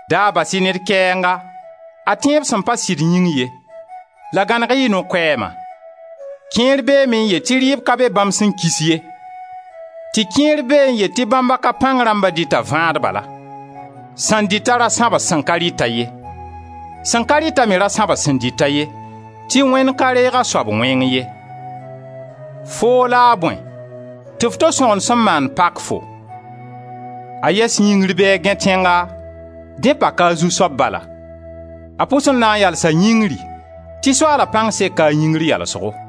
Da bas-y ned kɛɛnga, a tẽeb sẽn pa sɩd yĩng ye la gãneg-y y no-koɛɛma. Kẽer beeme n yet tɩ rɩɩb ka be bãmb sẽn kis ye, tɩ kẽer bee n yet tɩ bãmb a ka pãng rãmbã dɩta vãad bala. Sẽn dɩt-a ra sãbs sẽn ka rɩt-a ye. Sẽn ka rɩt-a me ra sãbs sẽn dɩt-a ye, tɩ Wẽnd ka reega a soab wẽng ye. Foom la a bõe tɩ f to sõgen sẽn maand pak-fo? A yɛs yĩngri bɩ a gãe tẽnga, dẽ paka a zu-soab bala. A pʋs n na n yalsa yĩngri tɩ Soaala pãng seka a yĩngr yalsgo.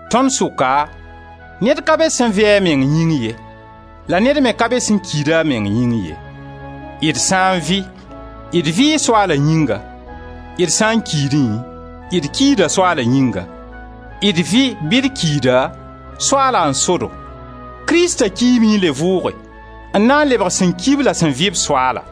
Tõnd sʋka, ned ka be sẽn vɩ-a a meng yĩng ye la ned me ka be sẽn kiid-a a meng yĩng ye. D sã n vɩ d vɩɩ Soaala yĩnga, d sã n kiidẽ, d kiida Soaala yĩnga. D vɩ bɩ d kiida, Soaala n so-do. Krista kiime n le vʋʋge, n na n lebg sẽn ki-b la sẽn vɩ-b Soaala.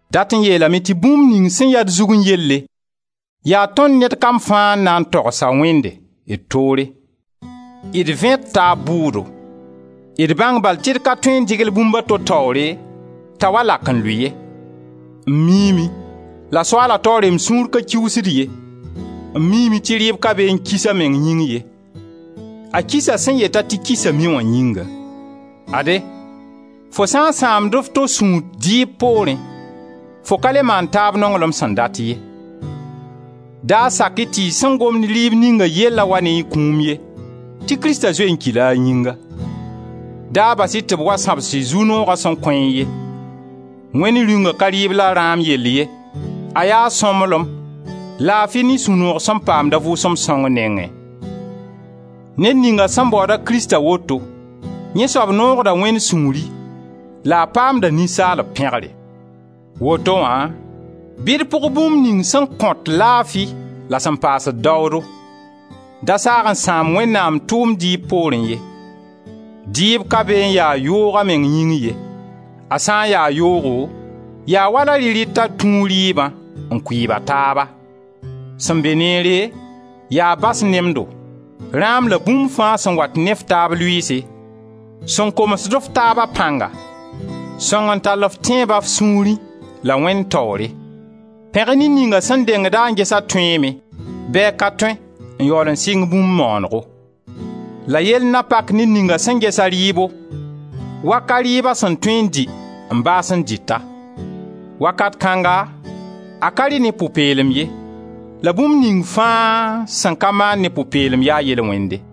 Dat n yeelame tɩ bũmb ning sẽn ya d zugẽ yelle, yaa tõnd ned kam fãa n na n togs-a Wẽnde, d toore. D vẽ d taab bʋʋdo. D bãng bal tɩ d ka tõe n dɩgl bũmb d to taoore t'a wa lak n lʋɩ ye. M miime, la Soaala taoore m sũur pa kiuusd ye, m miime tɩ rɩɩb ka be n kis a meng yĩng ye, a kisa sẽn yet-a tɩ kisame wã yĩnga. Ade, fo sã n sãamd f to sũur dɩɩb poorẽ, fo ka le maand taab nonglem sẽn dat ye; da sak-y tɩ y sẽn gomd rɩɩb ninga yellã wa ne a kũum ye, tɩ Krista zoe n kila a yĩnga. Da bas-y tɩ b wa sãbs y zu-nooga sẽn kõ-y ye. Wẽnd Rĩunga ka rɩɩb la rãam yell ye, a yaa sõmblem, laafi ne sũ-noog sẽn paamd a Vʋʋsem Sõng nengẽ. Ned ninga sẽn baooda Krista woto, yẽ soab noogd-a Wẽnd sũuri la a paamda ninsaalb pẽgre. Woto wã bɩ d pʋg bũmb ning sẽn kõt laafi la sẽn paasd daoodo. Da saag n sãam Wẽnnaam tʋʋmd dɩɩb poorẽ ye. Dɩɩb ka be n ya yoog a meng yĩng ye, a sã ya yoogo yaa wala rɩ-rɩta tũu rɩɩbã n kʋɩɩb a taaba. Sẽn be neere, yaa bas nemdo, rãam la bũmb fãa sẽn wat ne f taab lʋɩɩse, sẽn komsd f taaba pãnga. Sõng n tall f tẽebã f sũurẽ la Wẽnd taoore. Pẽg-y ned ninga sẽn dengda n ges a tõeeme bɩ a ka tõe n yaool n sɩng bũmb maanego. La yell na pak ned ninga sẽn ges-a rɩɩbo wa ka rɩɩb a sẽn tõe n dɩ n baas n dɩt-a; wakat kãnga a ka rɩ ne pʋ-peelem ye, la bũmb ning fãa sẽn ka maan ne pʋ-peelem yaa yel-wẽnde.